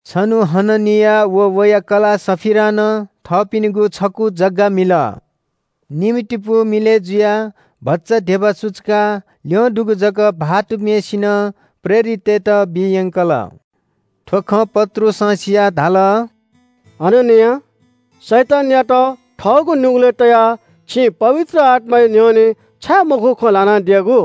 छन्‍हु हननिया व वया कलाः सफीरां नं थःपिनिगु छकू जग्‍गा मिल। निम्‍हतिपू मिलय् जुयाः भचा धिबा सुचुकाः ल्‍यं दुगु जक भाःतम्‍हय्‌सिनं प्रेरिततय्‌त बी यंकल। थ्‍व खँ पत्रुसं सियाः धाल – “हननिया, शैतानयात थःगु नुगलय् तयाः छिं पवित्र आत्‍माया न्‍ह्यःने छाय् मखुगु खँ ल्‍हानादियागु?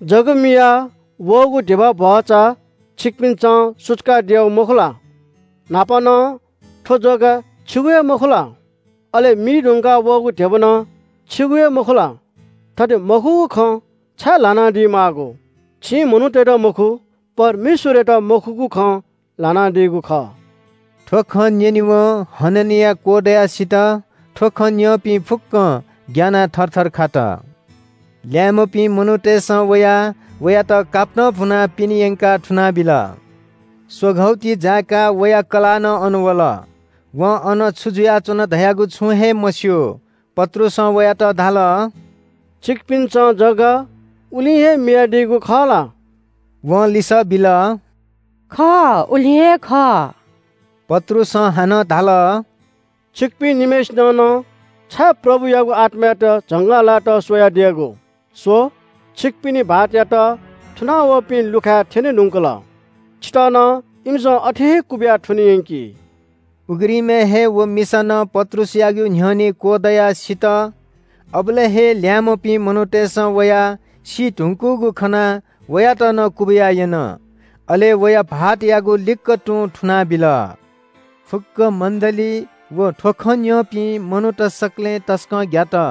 जग्‍गा मियाः वःगु धिबा भचा छिकपिन्‍सं सुचुकादियागु मखु ला? न्‍हापा नं थ्‍व जग्‍गा छिगु हे मखु ला? अले मी धुंकाः वःगु धिबा नं छिगु हे मखु ला? थथे मखुगु खँ छाय् ल्‍हानादी माःगु? छिं मनूतय्‌त मखु, परमेश्‍वरयात मखुगु खँ ल्‍हानादीगु खः।” थ्‍व खँ न्‍यनेवं हननिया क्‍वदयाः सित। थ्‍व खँ न्‍यंपिं फुक्‍कं ग्‍यानाः थरथर खात। ल्‍याय्‌म्‍हपिं मनूतय्‌सं वयाः वयात कापतं भुनाः पिने यंकाः थुनाबिल। स्‍वघौ ति जाय्‌काः वया कलाः नं अन वल। वं अन छु जुयाच्‍वन धयागु छुं हे मस्‍यू। पत्रुसं वयात धाल – “छिकपिन्‍सं जग्‍गा उलिं हे मियादीयागु खः ला?” वं लिसः बिल – “खः, उलिं हे खः।” पत्रुसं हानं धाल – “छिकपिं निम्‍हय्‌सिनं नं छाय् प्रभुयागु आत्‍मायात झंगःलाय्‌त स्‍वयादियागु? स्‍व, छिकपिनि भाःतयात थुना वःपिं लुखाय् थ्‍यने धुंकल। छितः नं इमिसं अथे हे क्‍वबिया थुने यंकी।” उघ्रिमय् हे व मिसा नं पत्रुसयागु न्‍ह्यःने क्‍वदयाः सित। अबलय् हे ल्‍याय्‌म्‍हपिं मनूतय्‌सं वयाः सी धुंकूगु खनाः वयात नं क्‍वबिया यन। अले वया भाःतयागु लिक्‍क तुं थुनाबिल। फुक्‍क मण्‍डली व थ्‍व खँ न्‍यंपिं मनूत सकलें तसकं ग्‍यात।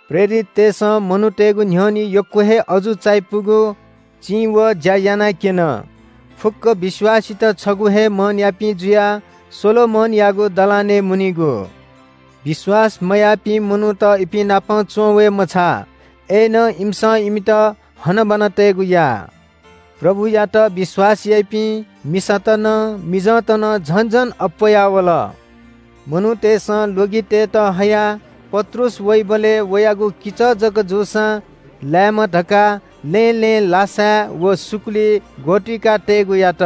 प्रेरिततय्‌सं मनूतय्‌गु न्‍ह्यःने यक्‍व हे अजू चायापुगु चिं व ज्‍या यानाक्‍यन। फुक्‍क विश्‍वासीत छगू हे मनयापिं जुयाः सोलोमनयागु दलानय् मुनीगु। विश्‍वास मयाःपिं मनूत इपिं नाप च्‍वंवये मछाः, अय्‌नं इमिसं इमित हनाबना तयेगु याः। प्रभुयात विश्‍वास याइपिं, मिसात नं मिजंत नं झन झन अप्‍वयावल। मनूतय्‌सं ल्‍वगितय्‌त हयाः पत्रुस वइबलय् वयागु किचः जक जूसां लाय्‌मा धकाः लँय् लँय् लासाय् व सुकुली ग्‍वतुइका तयेगु यात।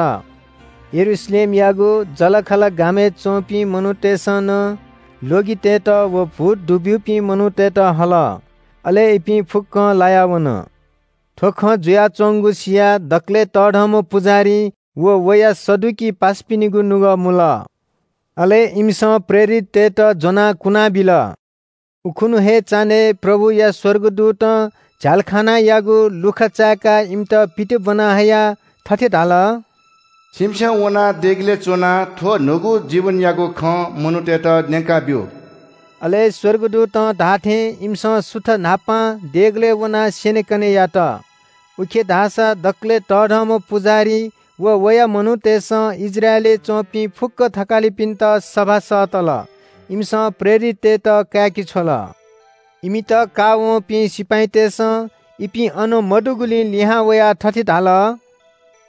यरूशलेमयागु जःलाखःला गामय् च्‍वंपिं मनूतय्‌सं नं ल्‍वगितय्‌त व भूत दुब्‍यूपिं मनूतय्‌त हल। अले इपिं फुक्‍कं लाया वन। थ्‍व खँ जुयाच्‍वंगु सियाः दकलय् तःधंम्‍ह पुजाहारी व वया सदुकी पासापिनिगु नुगः मुल। अले इमिसं प्रेरिततय्‌त ज्‍वनाः कुनाबिल। उखुन्‍हु हे चान्‍हय् प्रभुया स्‍वर्गदूतं झ्‍यालखानायागु लुखा चाय्‌काः इमित पित ब्‍वना हयाः थथे धाल – “छिमिसं वनाः देगलय् च्‍वनाः थ्‍व न्‍हूगु जीवनयागु खँ मनूतय्‌त न्‍यंकाब्‍यु।” अले स्‍वर्गदूतं धाःथें इमिसं सुथ न्‍हापां देगलय् वनाः स्‍यनेकने यात। उखे धाःसा दकलय् तःधंम्‍ह पुजाहारी व वया मनूतय्‌सं इस्राएलय् च्‍वंपिं फुक्‍क थकालिपिन्‍त सभा सःतल। इमिसं प्रेरिततय्‌त काय्‌के छ्वल। इमित काःवंपिं सिपाइँतय्‌सं इपिं अन मदुगुलिं लिहां वयाः थथे धाल –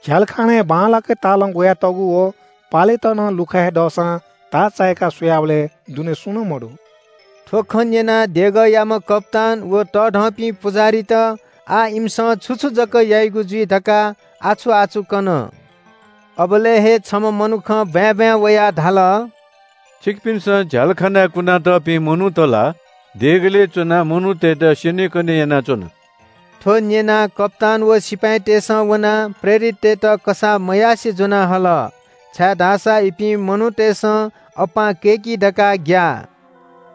“झ्‍यालखानाय् बांलाक हे तालं ग्‍वयातःगु व पालेत नं लुखाय् हे दःसां ताः चाय्‌का स्‍वयाबलय् दुने सुं नं मदु।” थ्‍व खँ न्‍यनाः देगःयाम्‍ह कप्‍तान व तःधंपिं पुजाहारीत आः इमिसं छु छु जक याइगु जुइ धकाः आछु-आछु कन। अबलय् हे छम्‍ह मनुखं ब्‍वाँय् ब्‍वाँय् वयाः धाल – “छिकपिन्‍सं झ्‍यालखानाय् कुना तःपिं मनूत ला देगलय् च्‍वनाः मनूतय्‌त स्‍यनेकने यानाच्‍वन।” थ्‍व न्‍यनाः कप्‍तान व सिपाइँतय्‌सं वनाः प्रेरिततय्‌त कसाः मयासें ज्‍वना हल, छाय्‌धाःसा इपिं मनूतय्‌सं अप्‍पां कय्‌की धकाः ग्‍याः।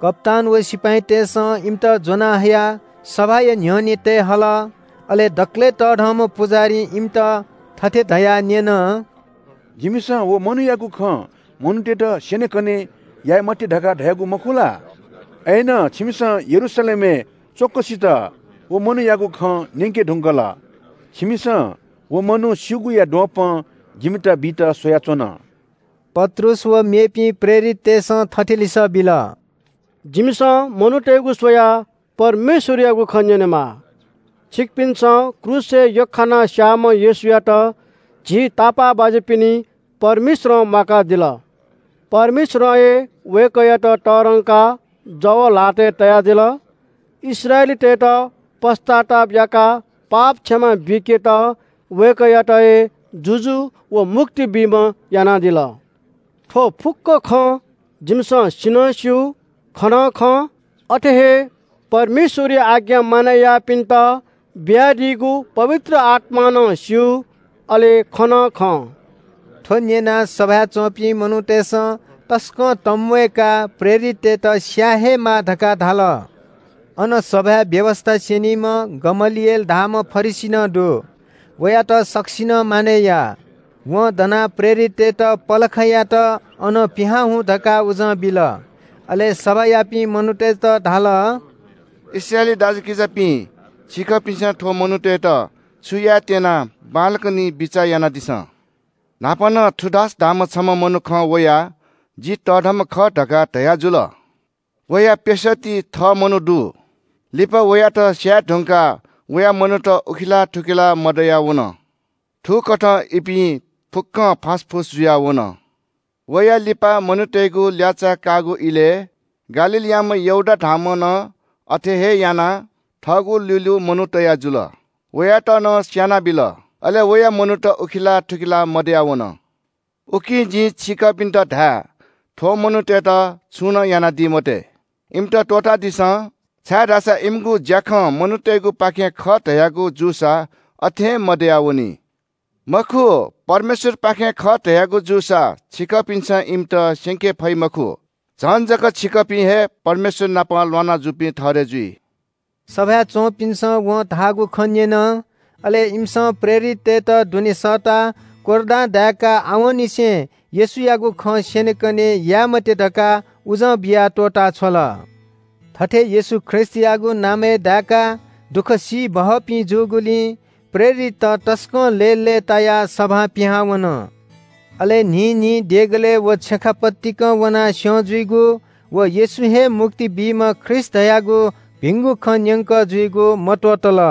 कप्‍तान व सिपाइँतय्‌सं इमित ज्‍वनाहयाः सभाया न्‍ह्यःने तये हल। अले दकलय् तःधंम्‍ह पुजाहारीं इमित थथे धयाः न्‍यन – “जिमिसं व मनूयागु खँ मनूतय्‌त स्‍यनेकने याये मते धकाः धयागु मखु ला? अय्‌नं छिमिसं यरूशलेमय् च्‍वँक्‍वसित व मनूयागु खँ न्‍यंके धुंकल। छिमिसं व मनू सीगुया द्वपं जिमित बीत स्‍वयाच्‍वन।” पत्रुस व मेपिं प्रेरिततय्‌सं थथे लिसः बिल – “जिमिसं मनूतय्‌गु स्‍वयाः परमेश्‍वरयागु खँ न्‍यनेमाः। छिकपिन्‍सं क्रूसय् यख्‍खानाः स्‍याःम्‍ह येशूयात झी तापाःबाज्‍यापिनि परमेश्‍वरं म्‍वाकादिल। परमेश्‍वरं हे वय्‌कःयात तःधंकाः जव ल्‍हातय् तयादिल। इस्राएलीतय्‌त पश्‍चाताप याकाः पाप क्षमा बीकेत वय्‌कःयात हे जुजु व मुक्ति बीम्‍ह यानादिल। थ्‍व फुक्‍क खँ जिमिसं सि नं स्‍यू, खँ नं खं। अथे हे परमेश्‍वरया आज्ञा मानय् याःपिन्‍त बियादीगु पवित्र आत्‍मां नं स्‍यू, अले खँ नं खं।” थ्‍व न्‍यनाः सभाय् च्‍वंपिं मनूतय्‌सं तसकं तंम्‍वय्‌काः प्रेरिततय्‌त स्‍याये हे माः धकाः धाल। अन सभाय् व्‍यवस्‍था स्‍यनीम्‍ह गमलिएल धाःम्‍ह फरिसी नं दु। वयात सकसिनं मानय् याः। वं दनाः प्रेरिततय्‌त पलखयात अनं पिहां हुँ धकाः उजं बिल। अले सभायापिं मनूतय्‌त धाल – “इस्राएली दाजुकिजापिं, छिकपिन्‍सं थ्‍व मनूतय्‌त छु यायेत्‍यना बांलाक निं बिचाः यानादिसँ। न्‍हापा नं थूदास धाःम्‍ह छम्‍ह मनुखं वयाः ‘जि तःधंम्‍ह खः’ धकाः धयाजुल। वया प्‍यसःति थः मनू दु। लिपा वयात स्‍यायेधुंकाः वया मनूत उखेलाः थुखेलाः मदयावन। थुकथं इपिं फुक्‍कं फासफुस जुयाः वन। वयां लिपा मनूतय्‌गु ल्‍याःचाः काःगु इलय् गालीलयाम्‍ह यहूदा धाःम्‍हं नं अथे हे यानाः थःगु ल्‍यूल्‍यू मनू तया जुल। वयात नं स्‍यानाबिल। अले वया मनूत उखेलाः थुखेलाः मदयावन। “उकिं जिं छिकपिन्‍त धाये – थ्‍व मनूतय्‌त छुं नं यानादी मते। इमित त्‍वःतादिसँ, छाय्‌धाःसा इमिगु ज्‍याखँ मनूतय्‌गुपाखें खः धयागु जूसा अथें मदयावनी। मखु, परमेश्‍वरयापाखें खः धयागु जूसा छिकपिन्‍सं इमित स्‍यंके फइ मखु। झन जक छिकपिं हे परमेश्‍वर नाप ल्‍वाना जूपिं ठहरय् जुइ।” सभाय् च्‍वंपिन्‍सं वं धाःगु खँ न्‍यन। अले इमिसं प्रेरिततय्‌त दुने सःताः कोर्रां दाय्‌काः आवंनिसें येशूयागु खँ स्‍यनेकने याये मते धकाः उजं बियाः त्‍वःता छ्वल। थथे येशू ख्रीष्‍टयागु नामय् दाय्‌काः दुःख सी बहःपिं जूगुलिं प्रेरितत तसकं लय्‌लय्‌तायाः सभां पिहां वन। अले न्‍हिं न्‍हिं देगलय् व छेँखा पतिकं वनाः स्‍यं जुइगु व येशू हे मुक्ति बीम्‍ह ख्रीष्‍ट खः धयागु भिंगु खँ न्‍यंकः जुइगु मत्‍वःतल।